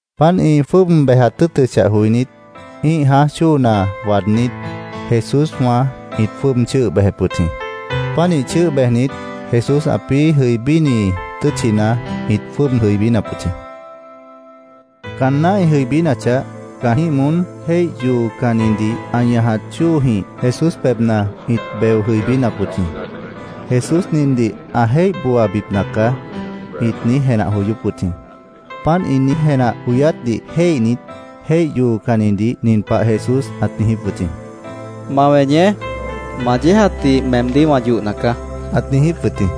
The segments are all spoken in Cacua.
Páant ĩ jwʉ́ʉb bejat tʉ́ʉtʉchah joinít, ĩ́ih jãáj chóona waadnít, Jesúswã ĩt jwʉ́ʉb chʉ́ʉh bejep wʉt jĩ. Pánih chʉ́ʉh bejnit, Jesús ãpĩ́ jʉibíni tʉ́tchina ĩt jwʉ́ʉb jʉibínap wʉt jĩ. Caanná ĩ jʉibínachah, caanjĩ́h moón jéih yoocannidih ã ñajat chóojĩh Jesús pebhna ĩt beo jʉibínap wʉt jĩ. “Jesús nindih ã jéih booabipna caá”, ĩt niíj jenah joyóp wʉt jĩ. Páant ĩ niíj jenah joyátdih jéihnit, jéih yoocannidih nin pah Jesús ãt niijíp wʉt jĩ: —Ma weñeé. Ma yéejatdih meemdíh wã yohna caá, ãt niijíp wʉt jĩ.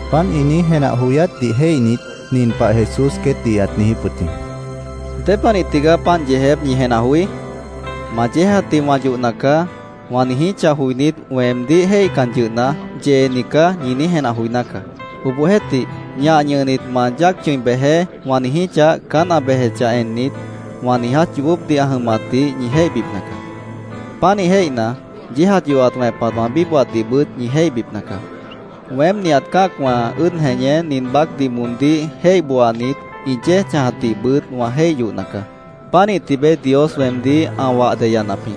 Páant ĩ niíj jenah joyátdih jéihnit, nin pah Jesús queétdih ãt niijíp wʉt jĩ: —¿Dépanih tigaá páant yeejép ñi jenah joí? ‘Ma yéejatdih wã yohna caá’, wã niijíchah joinít, weemdíh jéihcan yʉhna, ‘Yeeni caá’, ñi niíj jenah joiná caá. Obohjeéhtih, ‘Ñah ñʉhnit, ma yáac chʉ̃i bejeé’, wã niijíchah, caán ã bejechah ennit, wã niiját yoobópdih ã jʉmatdih ñi jéihbipna caá. Pánih jéihna, yéejat yohat wẽpat wã bíbohatdihbʉt ñi jéihbipna caá. Weém nihat cã́acwã ʉ́ʉd jeñé, nin baácdih moondíh jéih booanit, ĩ yéej chãjatdihbʉt wã jéih yohna caá. Pánih tibeé Dios weemdíh ã wah deyanap jĩ,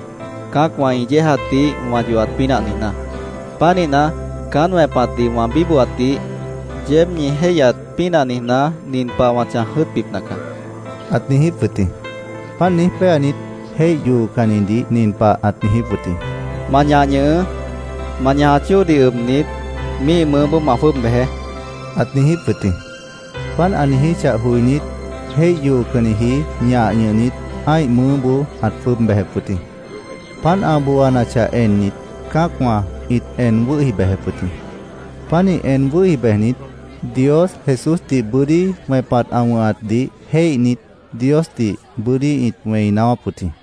cã́acwã ĩ yéejatdih wã yohat pínah niijná. Pánihna, caán wẽpatdih wã bíbohatdih yeéb ñi jéihyat pínah niijná, nin pah wã chãj jʉ́ʉtbipna caá, ãt niijíp wʉt jĩ. Páant niíj péanit, jéih yoocannidih nin pah ãt niijíp wʉt jĩ: —Ma ñah ñʉhʉʉ́. Ma ñajat chóodih ʉbnit, míih mʉʉ́boó ma jwʉ́ʉb bejeé, ãt niijíp wʉt jĩ. Páant ã niijíchah joinít, jéih yoocanniji ñah ñʉhnit, ã́ih mʉʉ́boó ãt jwʉ́ʉb bejep wʉt jĩ. Páant ã booanachah ennit, cã́acwã ĩt en wʉ́hi bejep wʉt jĩ. Pánih en wʉ́hi bejnit, Dios Jesúsdih bʉ́dí wẽpat ã wʉ̃hatdih jéihnit, Diosdih bʉ́dí ĩt wẽi naáwáp wʉt jĩ.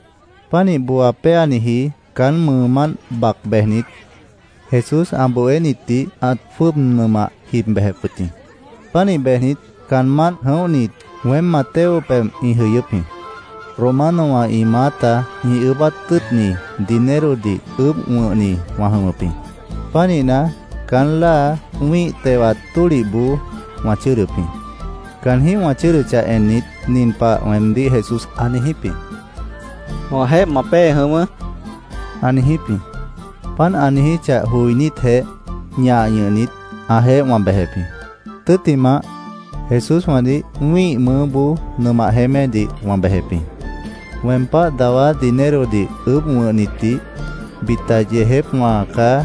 Pánih booa péaniji caán mʉʉmánt bac bejnit, Jesús ã bohénitdih ãt jwʉ́ʉb nʉmah jib bejep wʉt jĩ. Pánih bejnit, caanmánt jʉ̃óhnit, weém Mateo pebh ĩ jʉyʉ́p jĩ. Romanowã ĩ maáta ĩ ʉʉ́bát tʉ́ʉtni dinerodih ʉʉ́bh wʉ̃hni wã jʉmʉp jĩ. Pánihna, caán láa wĩ́ih tewat tólihboó wã chʉ́ʉdʉp jĩ. Caanjĩ́h wã chʉ́ʉdʉchah ennit, nin pah weemdíh Jesús ã niijíp jĩ: —Wãjeéh ma pée jʉ̃ʉ́wʉ́, ã niijíp jĩ. Páant ã niijíchah joinítjeh, ñah ñʉhnit, ãjeéh wã bejep jĩ. Tʉ́ttimah, Jesúswãdih wĩ́ih mʉʉ́boó nʉmah jeémédih wã bejep jĩ. Weem páh dawá dinerodih ʉʉ́bh wʉ̃hnitdih, bita “Yeejépwã caá”,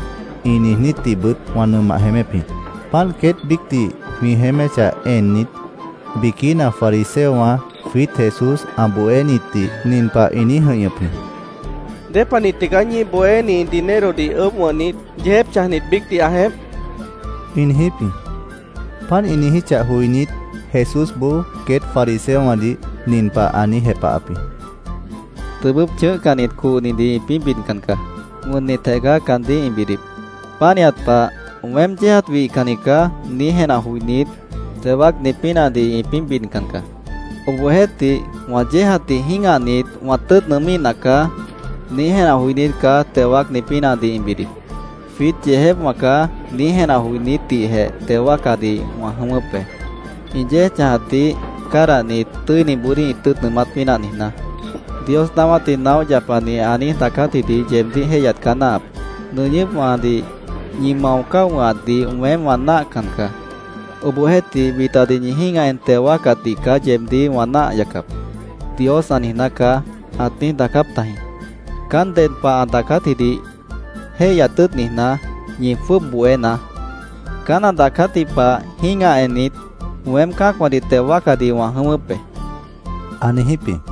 ĩ niijnítdihbʉt wã nʉmah jeémép jĩ. Páant queét biícdih jwĩ jeéméchah ennit, biquína fariseowã jwiít Jesús ã bohénitdih nin pah ĩ niíj jʉ̃ihñʉp jĩ: —¿Dépanih tigaá ñíih bohéni dinerodih ʉʉ́bh wʉ̃hnit, yeejép chãjnit biícdih ã jeémp? ĩ niijíp jĩ. Páant ĩ niijíchah joinít, Jesúsboó queét fariseowãdih nin pah ã niíj jepahap jĩ: —Tʉbʉ́p chʉ̃ʉ́hcannit cohnidih ĩpĩ́ bidcan caá. Wʉnnitjeh caá caandíh ĩ bidip. Pánihat pah ‘Weém yéejat wihcanni caá’, niíj jenah joinít, teo wáacni pínahdih ĩpĩ́ bidcan caá. Obohjeéhtih, ‘Wã yéejatdih jĩ́gahnit, wã tʉ́ʉt nʉʉ́míhna caá’, niíj jenah joinít caá teo wáacni pínahdih ĩ bidip. ‘Jwiít yeejépwã caá’, niíj jenah joinítdihjeh teo wáacadih wã jʉ̃ʉ́wʉ́p be, ĩ yéej chãjatdih cádahnit, tʉ́iniboodíh ĩ tʉ́ʉt nʉʉmát pínah niijná. Dios naáwátdih naóh yapani ã niíj daacátjidih yeebdíh jéihyat caá náahap. ‘ “Nʉñʉ́pwãdih ñi mao cáo wʉ̃hatdih weém wã náahcan caá. Obohjeéhtih, bitadih ñi jĩ́gah en teo wáacatdih caá yeebdíh wã náah yacap”, Dios ã niijná caá’, ãt niíj daacáp tajĩ.Caán ded pah ã daacátjidih jéihyat tʉ́ʉt niijná, ñi jwʉ́ʉb bohénaá. Caán ã daacátji pah, jĩ́gah ennit, weém cã́acwãdih teo wáacadih wã jʉ̃ʉ́wʉ́p be, ã niijíp jĩ.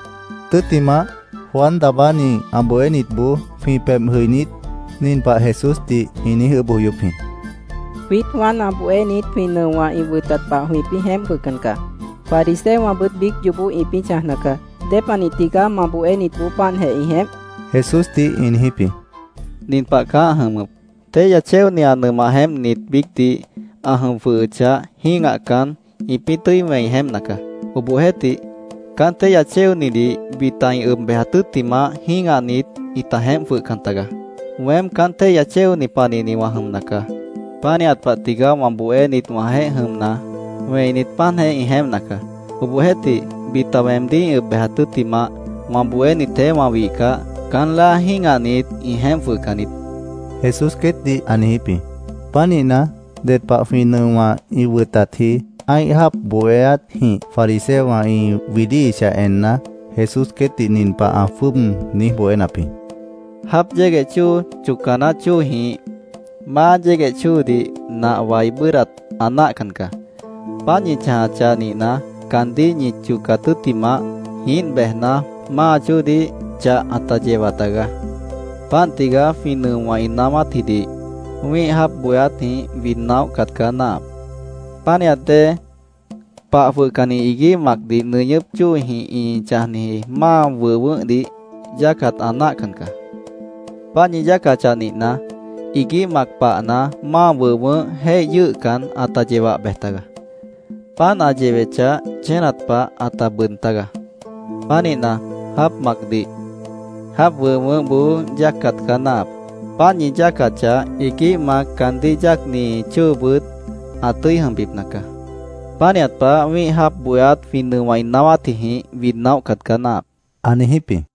Tʉ́ttimah, Juan Daabáni ã bohénitboó jwĩ pebh jʉinít, nin pah Jesúsdih ĩ niíj ʉʉ́bh joyóp jĩ: —Jwiít Juan ã bohénit, jwĩ nʉowã ĩ wʉtat pah jwĩpĩ́ jeémp jwʉhcan caá. Fariseowãbʉt biíc yoobó ĩpĩ́ chãjna caá. ¿Dépanih tigaá ma bohénitboó páantjeh ĩ jeémp? Jesúsdih ĩ niijíp jĩ. —Nin pah caá ã jʉmʉp: Téihya chéoni ã nʉmah jeémpnit biícdih ã jʉm jwʉhʉchah, jĩ́gahcan, ĩpĩ́ tʉ́i wẽi jeémpna caá. Obohjeéhtih, caán téihya chéonidih bita ĩ ʉb bejat tʉ́ttimah, jĩ́gahnit, ĩta jeémp jwʉhcan tagaá. Weém caán téihya chéoni panihni wã jʉmna caá. Pánihat pah tigaá wã bohénit wãjeéh jʉmna, wẽinit, páantjeh ĩ jeémpna caá. Obohjeéhtih, bita weemdíh ĩ ʉb bejat tʉ́ttimah, wã bohénitjeéh wã wihcah, caán láa jĩ́gahnit, ĩ jeémp jwʉhcan niít, Jesús queétdih ã niijíp jĩ. Pánihna, ded pah jwĩ nʉowã ĩ wʉtatji ã́ih jáap bohéátjĩh fariseowã ĩ widíhichah enna, Jesús queétdih nin pah ã jwʉ́ʉb niíj bohénap jĩ: “Jáap yégueh chóo chocca naáh chóojĩh máa yégueh chóodih nah wai bʉ́ʉdhdat ã náahcan caá. Páant ñi chãjachah nihna, caandíh ñi chocat tʉ́ttimah, jiínt bejna, máa chóodih chah ãta yewa tagaá. Páant tigaá jwĩ nʉowã ĩ naáwátjidih wĩ́ih jáap bohéátjĩh wid naóhcat caá náahap. Pánihat dée, pah jwʉhcanni iguíh macdih nʉñʉ́p chóojĩh ĩ chãjniji máa wʉh wʉʉ́hdih yáacat ã náahcan caá. Páant ñi yáacachah nihna, iguíh mac pahna, máa wʉh wʉʉ́h jéih yʉ́ʉhcan, ãta yewah bej tagaá. Páant ã yewechah, chénat pah ãta bʉʉd tágaá. Pánihna, jáap macdih, jáap wʉh wʉʉ́hboó yáacat caá náahap. Páant ñi yáacachah, iguíh mac, caandíh yáacni chóobʉt ã tʉ́i jʉmbipna caá. Pánihat pah, wĩ́ih jáap bohéát jwĩ nʉowã ĩ naáwátjijĩh wid naóhcat caá náahap”, ã niijíp jĩ.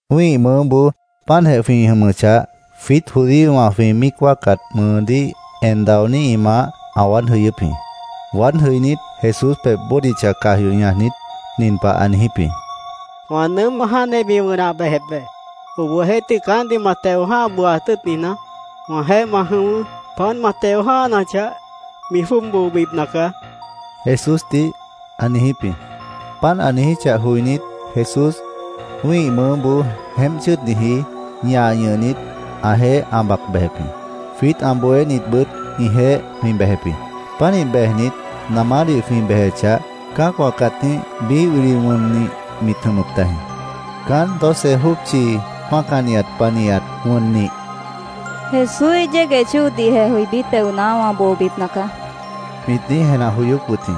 Wĩ́ih mʉʉ́boó páantjeh jwĩ jʉmʉchah, jwiít judíowã jwĩ míic wáacat mʉʉdíh en daonít ĩ maáh ã waád jʉyʉ́p jĩ. Waád jʉinít, Jesús pebh bódicha caj yoh ñajnit, nin pah ã niijíp jĩ: —Wã nʉʉ́m jáantjeh mi wʉnah bejep be. Obohjeéhtih, caántdih ma teo jã́ha booaat tʉ́ʉt niijná, wãjeéh ma jʉ̃ʉ́wʉ́. Páant ma teo jã́hanachah, mi jwʉ́ʉb boobipna caá, Jesúsdih ã niijíp jĩ. Páant ã niijíchah joinít, Jesús wĩ́ih mʉʉ́boó jeémp chʉ́ʉdniji, ñah ñʉhnit, ãjeéh ã bac bejep jĩ. Jwiít ã bohénitbʉt ĩjeéh jwĩ bejep jĩ. Pánih bejnit, namádih jwĩ bejechah, cã́acwã cãtíh biíh wili wʉnnih mit jʉmʉp tajĩ. Caánt doce jópchi mácanihat panihat wʉnnih, “Jesúíh yégueh chóodihjeh jʉibí teona, wã boobipna caá”, mit niíj jenah joyóp wʉt jĩ.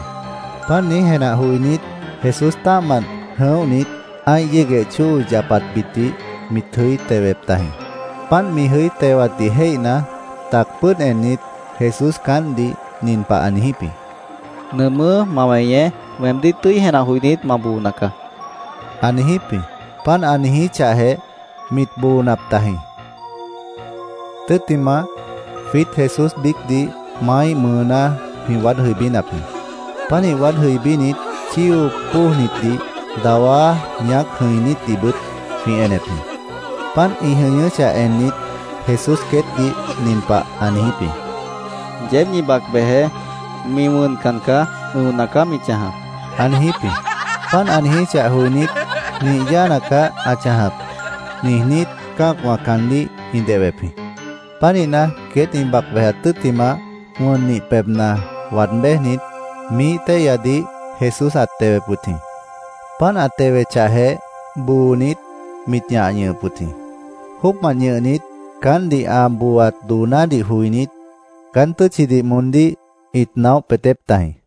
Páant niíj jenah joinít, Jesús tã́ahmant jʉ̃óhnit, ã́ih yégueh chóo yapatbitdih mit jʉí tewep tajĩ. Páant mi jʉí tewatdih jéihna, tac pʉ́ʉd ennit, Jesús caántdih nin pah ã niijíp jĩ: —Nʉʉmʉ́, ma weñeé. Weemdíh tʉ́i jenah joinít, ma boona caá, ã niijíp jĩ. Páant ã niijíchahjeh, mit boonap tajĩ. Tʉ́ttimah, jwiít Jesús biícdih maáíh mʉʉná jwĩ waád jʉibínap jĩ. Pánih waád jʉibínit, chío póojnitdih, dawá ñaác jʉ̃inítdihbʉt jwĩ enep jĩ. Páant ĩ jʉñʉ́chah ennit, Jesús queétdih nin pah ã niijíp jĩ: —Yeéb ñi bac bejeé. Mi wʉncan caá. Ʉ̃ona caá mi chãjap, ã niijíp jĩ. Páant ã niijíchah joinít, “Nih yáana caá ã chãjap”, niijnít, cã́acwã caandíh ĩ dehwep jĩ. Pánihna, queét ĩ bac bejat tʉ́ttimah, wʉnnih pebhna waad béjnit, miíh téihyadih Jesús ãt tewep wʉt jĩ. Páant ã tewechahjeh, boonit, mit ñah ñʉhʉp wʉt jĩ. Jóocmant ñʉhnit caántdih ã booaat doonádih joinít, caán tʉ́tchidih moondíh ĩt naóh peetép tajĩ.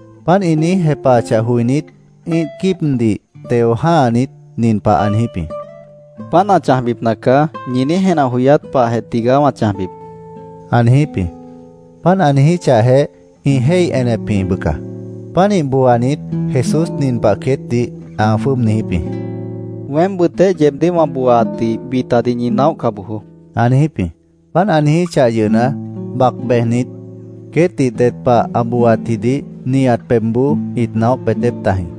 Páant ĩ niíj jepahachah joinít, ĩ́ih quíibdih teo jã́hanit, nin pah ã niijíp jĩ: —‘Páant ã chãjbipna caá’, ñi niíj jenah joyát pahjeh tigaá wã chãjbip, ã niijíp jĩ. Páant ã niijíchahjeh, ĩ jéih enep jĩ, bʉca. Pánih booanit, Jesús nin pah queétdih ã jwʉ́ʉb niijíp jĩ: —Weém bʉʉtéh yeebdíh wã booaatdih bitadih ñi naóhca bojoó, ã niijíp jĩ. Páant ã niijíchah yʉhna, bac bejnit, queétdih ded pah ã booaatjidih nihat pebhboó ĩt naóh peetép tajĩ.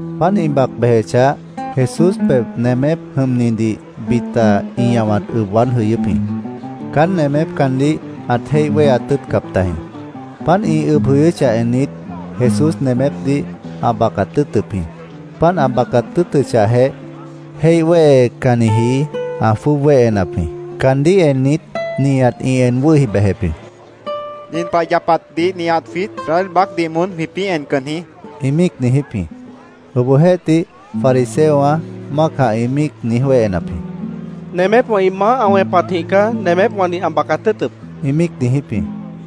Páant ĩ bac bejechah, Jesús pebh nemép jʉmnidih bita ĩ ñahwat ʉb waád jʉyʉ́p jĩ. Caán nemép caandíh ãt jéih wéheat tʉ́ʉtcap tajĩ. Páant ĩ ʉb jʉyʉ́chah ennit, Jesús nemépdih ã bacat tʉ́ʉtʉp jĩ. Páant ã bacat tʉ́ʉtʉchahjeh, jéih wéhecanniji ã jwʉ́ʉb wéhenap jĩ. Caandíh ennit, nihat ĩ en wʉ́hi bejep jĩ. —¡Nin pah yapatdih nihat jwiít Israel baácdih moón jwĩpĩ́ encan jĩ! ĩ míic niijíp jĩ. Obohjeéhtih, fariseowã mácah ĩ míic niíj wéhenap jĩ. —Nemépwã ĩ maáh ã wẽpatjĩh caá nemépwãdih ã bacat tʉ́ʉtʉp, ĩ míic niijíp jĩ.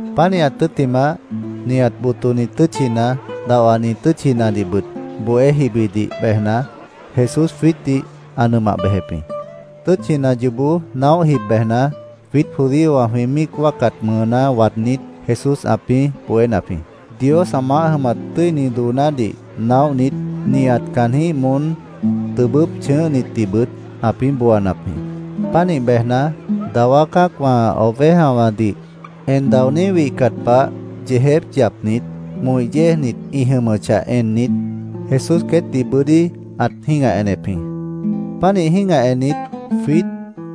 Pánihat tʉ́ttimah, nihat botoni tʉ́tchina, dahwani tʉ́tchinadihbʉt bohé jibidih bejna, Jesús jwiítdih ã nʉmah bejep jĩ. Tʉ́tchina yoobó naóh jib bejna, jwiít judíowã jwĩ míic wáacat mʉʉná waadnít, Jesús ãpĩ́ bohénap jĩ. Dios ã maáh jʉmat tʉ́ini doonádih naóhnit, nihat caanjĩ́h moón tʉbʉ́p chʉ̃ʉ́hnitdihbʉt ãpĩ́ booanap jĩ. Pánih bejna, dawá cã́acwã ovejawãdih en daoní wihcat pah yeejép yapnit, moh yéejnit ĩ jʉmʉchah ennit, Jesús queétdih bʉ́dí ãt jĩ́gah enep jĩ. Pánih jĩ́gah ennit, jwiít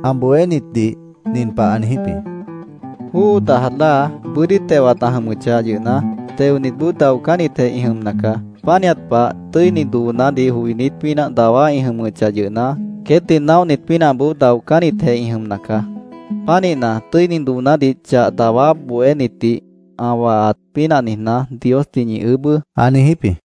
ã bohénitdih nin pah ã niijíp jĩ: —Jóo dajat láa bʉ́dí tewat ã jʉmʉchah yʉhna, teonitboó daocánnitjeh ĩ jʉmna caá. Pánihat pah, tʉ́ini doonádih joinít pínah dawá ĩ jʉmʉchah yʉhna, queétdih naóhnit pínahboó daocánnitjeh ĩ jʉmna caá. Pánihna, tʉ́ini doonádih chah dawá bohénitdih ã wahat pínah niijná, Diosdih ñi ʉʉ́bʉ́, ã niijíp jĩ.